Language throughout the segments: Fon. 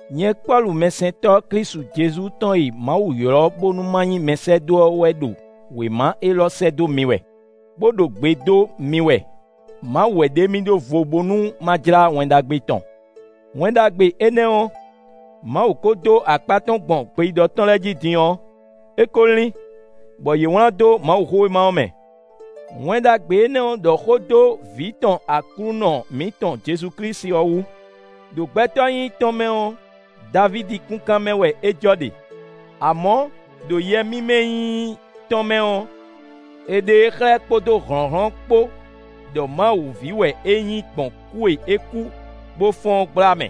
Nyɛ Pɔ́lu mɛsɛntɔ́ Klísu Jezu tɔn e Mawu ylɔ́ bónú ma nyí mɛsɛ́dó ɔ́ wɛ ɖo wěma élɔ́ sɛ́ dó mi wɛ, bó ɖo gbe dó mi wɛ; Mawu wɛ ɖe mì ɖó vo bónú ma jlá Wɛn Ɖagbe tɔn. Wɛn Ɖagbe énɛ́ ɔ́, Mawu ko dó akpá tɔn gbɔn gbeyíɖɔ tɔn lɛ́ɛ jí din ɔ́, é ko lín, bɔ yě wlán dó Mawuxówéma ɔ́ mɛ. Wɛn Ɖagbe énɛ́ ɖɔ xó dó Vǐ tɔn Aklúnɔ mǐtɔn Jezu Klísu ɔ́ wú. Đo gbɛtɔ́ nyínyí tɔn mɛ ɔ́, Davídi kúnkan mɛ wɛ é jɔ ɖe; amɔ̌, ɖo yɛ mímɛ́ nyínyí tɔn mɛ ɔ́, è ɖe e xlɛ́ kpódó hlɔ̌nhlɔ́n kpó ɖɔ Mawu ví wɛ é nyí gbɔn kú e é kú bó fɔ́n ɔ́ gbla mɛ.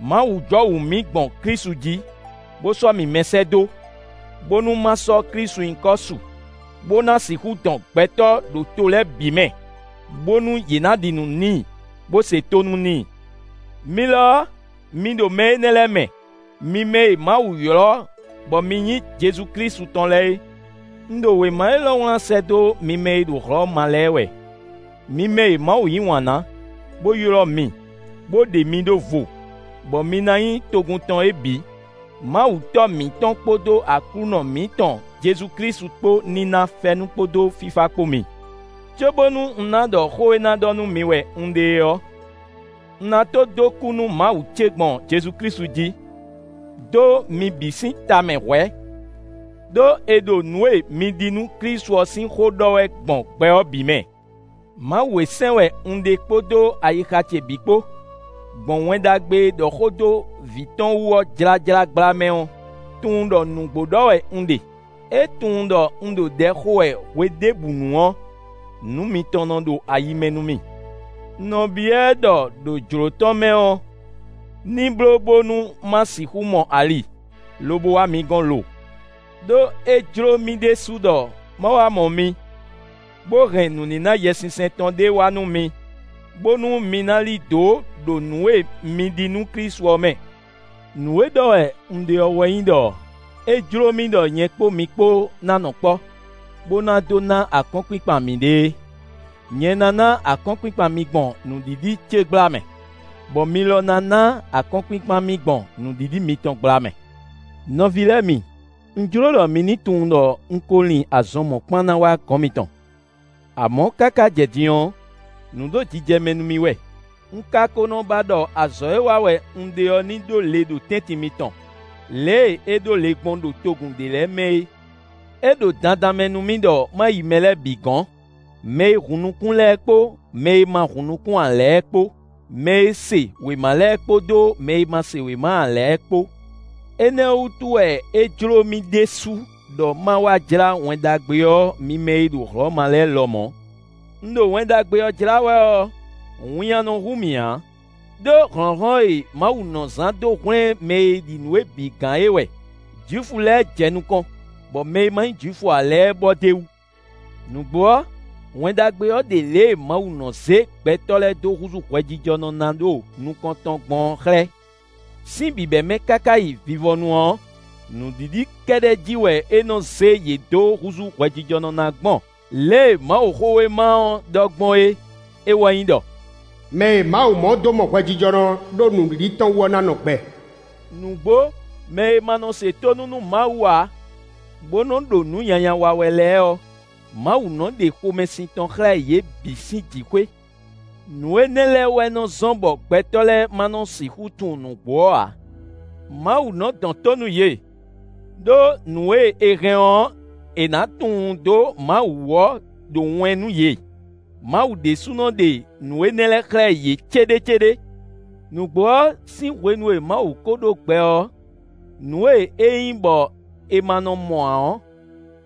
Mawu jɔwǔ mì gbɔn Klísu jí, bó sɔ́ mì mɛsɛ́dó, bónú ma sɔ́ Klísu nyǐkɔ su, bó ná sixú dɔn gbɛtɔ́ ɖo to lɛ́ɛ bǐ mɛ, bónú yě ná ɖi nǔ n'i, bó se tónú n'i. Mi lɔ, mi ɖo mɛ énɛ́ lɛ́ɛ mɛ, mi mɛ e Mawu ylɔ́ bɔ mi nyí Jezu Klísu tɔn lɛ́ɛ é. Un ɖo wěma élɔ́ wlán sɛ́ dó mi mɛ e ɖo Hlɔ̌ma lɛ́ɛ wɛ; mi mɛ e Mawu yí wǎn ná, bó ylɔ́ mi, bó ɖe mi ɖó vo, bɔ mi ná nyí togun tɔn é bǐ. Mawu Tɔ́ mǐtɔn kpódó Aklúnɔ mǐtɔn Jezu Klísu kpó ní ná fɛ́nú kpódó fífá kpó mi. Cóbónú un ná ɖɔ xó e ná ɖɔ nú mi wɛ un ɖe é ɔ́, un ná tó dó kú nú Mawu ce gbɔn Jezu Klísu jí, dó mi bǐ sín tamɛ hwɛ̌, ɖó è ɖo nǔ e mi ɖi nú Klísu ɔ́ sín xó ɖɔ wɛ gbɔn gbɛ ɔ́ bǐ mɛ. Mawu e sɛn wɛ un ɖe kpódó ayixa ce bǐ kpó, gbɔn Wɛn Ɖagbe e ɖɔ xó dó Vǐ tɔn wú ɔ́ jlájlá gbla mɛ ɔ́, tunwun ɖɔ nǔgbó ɖɔ wɛ un ɖe; é tunwun ɖɔ un ɖo ɖɛ xo wɛ hweɖěbǔnu ɔ́, nǔ mitɔn nɔ ɖo ayi mɛ nú mì. Un nɔ byɔ́ ɛ ɖɔ ɖo jlǒ tɔn mɛ ɔ́, ní bló bónú ma sixú mɔ ali, lobo wá mi gɔ́n lo. Đó é jló mì ɖésú ɖɔ ma wá mɔ mi, bó hɛn nǔníná Yɛsinsɛn tɔn ɖé wá nú mi, bónú mi ná lí dǒ ɖo nǔ e mi ɖi nú Klísu ɔ́ mɛ. Nǔ e ɖɔ wɛ un ɖe ɔ́ wɛ nyí ɖɔ é jló mì ɖɔ nyɛ kpó mi kpó ná nɔ kpɔ́, bó ná dó ná akɔ́nkpinkpan mǐɖée. Nyɛ ná ná akɔ́nkpinkpan mi gbɔn nǔɖiɖi ce gbla mɛ, bɔ mi lɔ ná ná akɔ́nkpinkpan mì gbɔn nǔɖiɖi mitɔn gbla mɛ. Nɔví lɛ́ɛ mi, un jló ɖɔ mi ní tunwun ɖɔ un ko lin azɔn mɔ̌kpán ná wá gɔn mitɔn, amɔ̌ káká jɛ din ɔ́, nǔ ɖo jijɛ mɛ nú mì wɛ. Un ka ko nɔ ba ɖɔ azɔ̌ e wa wɛ un ɖe ɔ́ ní ɖó le ɖo tɛ́ntin mitɔn, lě e é ɖó le gbɔn ɖo togun ɖě lɛ́ɛ mɛ é. É ɖo dandan mɛ nú mì ɖɔ ma yi mɛ lɛ́ɛ bǐ gɔ̌n; mɛ e hun nukún lɛ́ɛ kpó mɛ e ma hun nukún ǎ lɛ́ɛ kpó; mɛ e se wěma lɛ́ɛ kpódó mɛ e ma se wěma ǎ lɛ́ɛ kpó. Énɛ́ ɔ́ wútu wɛ é jló mì ɖésú ɖɔ ma wá jlá Wɛn Ɖagbe ɔ́ mi mɛ e ɖo Hlɔ̌ma lɛ́ɛ lɔmɔ̌. Un ɖo Wɛn Ɖagbe ɔ́ jlá wɛ ɔ́, winnyá nɔ hu mì ǎ, ɖó hlɔ̌nhlɔ́n e Mawu nɔ zán dó hwlɛ́n mɛ e ɖi nǔ é bǐ gán é wɛ; Jwifu lɛ́ɛ jɛ nukɔn, bɔ mɛ e ma nyí Jwifu ǎ lɛ́ɛ bɔ d'é wú. Nǔgbó ɔ́, Wɛn Ɖagbe ɔ́ ɖe lě e Mawu nɔ zé gbɛtɔ́ lɛ́ɛ dó húzú hwɛjijɔnɔ ná ɖo nukɔn tɔn gbɔn ɔ́ xlɛ́; sín bǐbɛ́mɛ káká yi vivɔnu ɔ́, nǔɖiɖi kɛ́ɖɛ́ jí wɛ é nɔ zé yě dó húzú hwɛjijɔnɔ ná gbɔn lě e Mawuxówéma ɔ́ ɖɔ gbɔn é; é wɛ nyí ɖɔ: “Mɛ e Mawu mɔ dó mɔ hwɛjijɔnɔ ɖó nǔɖiɖi tɔn wú ɔ́ ná nɔ gbɛ.” Nǔgbó mɛ e ma nɔ se tónú nú Mawu ǎ, bó nɔ́ ɖo nǔ nyanya wa wɛ lɛ́ɛ ɔ́, Mawu nɔ́ ɖe xomɛsin tɔn xlɛ́ yě bǐ sín jǐxwé, nǔ énɛ́ lɛ́ɛ wɛ nɔ zɔ́n bɔ gbɛtɔ́ lɛ́ɛ ma nɔ sixú tunwun nǔgbó ɔ́ ǎ. Mawu nɔ dɔn tó nú yě, ɖó nǔ e è hɛn ɔ́, è nǎ tunwun dó Mawu wú ɔ́ ɖo wɛn nú yě: Mawu ɖésúnɔ ɖe nǔ énɛ́ xlɛ́ yě céɖécéɖé. Nǔgbó ɔ́, sín hwenu e Mawu ko ɖó gbɛ ɔ́, nǔ e é nyí bɔ è ma nɔ mɔ ǎ ɔ́,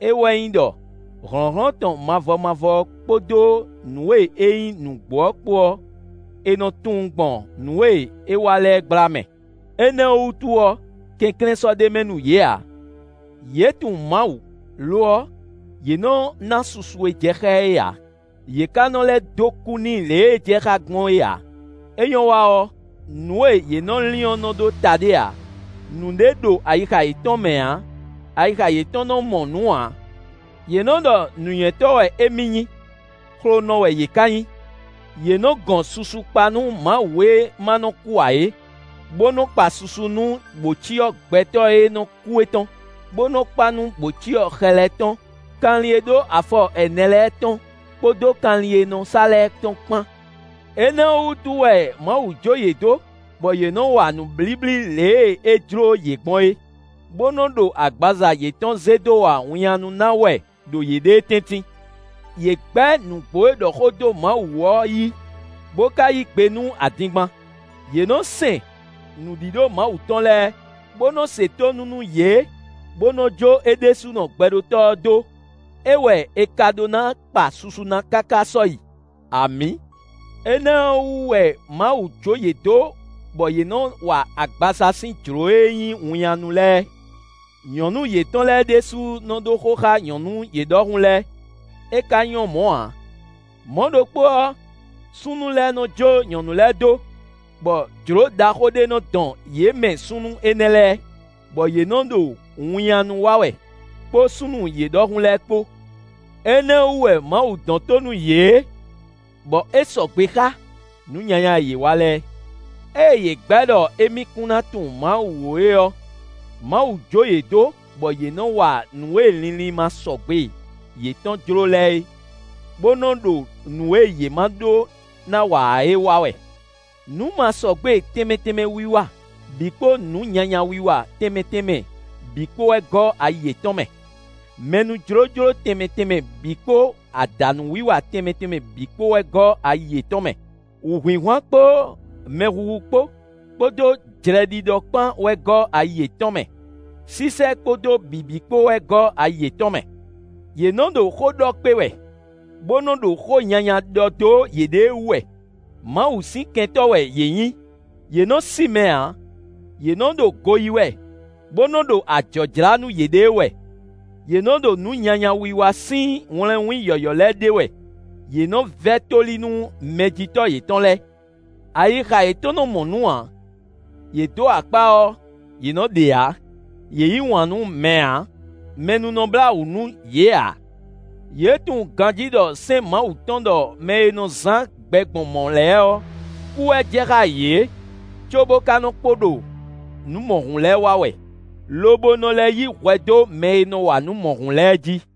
é wɛ nyí ɖɔ: hlɔ̌nhlɔ́n tɔn mavɔ mavɔ ɔ́ kpódó nǔ e é nyí nǔgbó ɔ́ kpó ɔ́, è nɔ tunwun gbɔn nǔ e é wa lɛ́ɛ gbla mɛ; énɛ́ ɔ́ wútu ɔ́, kɛnklɛ́n sɔ́ ɖ'é mɛ nú yě ǎ. Yě tunwun Mawu; lo ɔ́, yě nɔ ná susu e jɛ xá ɛ é ǎ; yě ka nɔ lɛ́ dó kú n'i lě e é jɛ xá gbɔn é ǎ; é nyɔ́ wa ɔ́, nǔ e yě nɔ lin ɔ́ nɔ ɖó ta ɖé ǎ; nǔɖé ɖo ayixa yětɔn mɛ ǎ; ayixa yětɔn nɔ mɔ nǔ ǎ. Yě nɔ ɖɔ nǔnywɛ́tɔ́ wɛ émí nyí; xlonɔ wɛ yě ka nyí. Yě nɔ́ gɔn susu kpa nú Mawu e ma nɔ kú ǎ é, bó nɔ kpa susu nú bǒcyɔ gbɛtɔ́ e nɔ kú é tɔn, bó nɔ́ kpa nú bǒcyɔ xɛ lɛ́ɛ tɔn, kanlin e ɖó afɔ ɛnɛ lɛ́ɛ tɔn kpódó kanlin e nɔ sá lɛ́ɛ tɔn kpán. Énɛ́ ɔ́ wútu wɛ Mawu jǒ yě dó bɔ yě nɔ́ wa nǔblíblí lě e é jló yě gbɔn é, bó nɔ ɖo agbaza yětɔn zé dó wa winnyánú ná wɛ ɖo yěɖée tɛ́ntin. Yě gbɛ́ nǔgbó e ɖɔ xó dó Mawu wú ɔ́ yí, bó ka yí gbe nú adingban. Yě nɔ́ sɛn nǔɖíɖó Mawu tɔn lɛ́ɛ, bó nɔ́ se tónú nú yě, bó nɔ́ jó é ɖésúnɔ Gbɛɖótɔ́ ɔ́ dó; é wɛ è ka ɖó ná kpa susu ná káká sɔ́yi. Amǐ. Énɛ́ ɔ́ wú wɛ Mawu jó yě dó bɔ yě nɔ wa agbaza sín jlǒ e nyí winnyánú lɛ́ɛ. Nyɔ̌nu yětɔn lɛ́ɛ ɖésú nɔ́ ɖó xó xá nyɔ̌nu yě ɖɔhun lɛ́ɛ; é ka nyɔ́ mɔ̌ ǎ. Mɔ̌ ɖokpó ɔ́, súnnu lɛ́ɛ nɔ́ jó nyɔ̌nu lɛ́ɛ dó, bɔ jlǒ ɖaxó ɖé nɔ dɔn yě mɛ súnnu énɛ́ lɛ́ɛ, bɔ yě nɔ ɖo winnyánú wa wɛ, kpó súnnu yě ɖɔhun lɛ́ɛ kpó. Énɛ́ ɔ́ wú wɛ Mawu dɔn tó nú yě, bɔ é sɔgbe xá nǔ nyanya e yě wa lɛ́ɛ. Ée yě gbɛ̌ ɖɔ émí kún ná tunwun Mawu ó é ɔ́, Mawu jǒ yě dó bɔ yě nɔ wa nǔ e linlin masɔgbe yětɔn jló lɛ́ɛ é, bó nɔ́ ɖo nǔ e yě má ɖó ná wa ǎ é wa wɛ. Nǔmasɔgbe tɛnmɛ tɛnmɛ wiwa bǐ kpó nǔ nyanya wiwa tɛnmɛ tɛnmɛ bǐ kpó wɛ gɔ́ ayi yětɔn mɛ; mɛnújlójló tɛnmɛ tɛnmɛ bǐ kpó adǎnúwiwa tɛnmɛ tɛnmɛ bǐ kpó wɛ gɔ́ ayi yětɔn mɛ. Wǔhwinhwan kpó mɛhuhu kpó, kpódó jlɛɖiɖɔ kpán wɛ gɔ́ ayi yětɔn mɛ; sísɛ́ kpódó bǐbí kpó wɛ gɔ́ ayi yětɔn mɛ; yě nɔ́ ɖo xó ɖɔ kpé wɛ, bó nɔ́ ɖo xó nyanya ɖɔ dó yěɖée wú wɛ; Mawu sín kɛntɔ́ wɛ yě nyǐ. Yě nɔ sí mɛ ǎ; yě nɔ ɖo go yí wɛ, bó nɔ́ ɖo ajɔ̌ jlá nú yěɖée wɛ. Yě nɔ ɖo nǔ nyanya wiwa sín wlɛnwín yɔ̌yɔ́ lɛ́ɛ ɖe wɛ; yě nɔ́ vɛ́ tóli nú mɛjitɔ́ yětɔn lɛ́ɛ. Ayixa yětɔn nɔ mɔ nǔ ǎ; yě dó akpá ɔ́, yě nɔ ɖe ǎ; yě yǐ wǎn nú mɛ ǎ; mɛ nú nɔ blá wǔ nú yě ǎ. Yě tunwun ganjí ɖɔ sɛ́n Mawu tɔn ɖɔ mɛ e nɔ zán gbɛ gbɔn mɔ̌ lɛ́ɛ ɔ́, kú wɛ jɛ xá yě, cóbó ka nɔ kpo ɖo nǔ mɔ̌hun lɛ́ɛ wa wɛ, lobo nɔ lɛ́ yí hwɛ dó mɛ e nɔ wa nǔ mɔ̌hun lɛ́ɛ jí.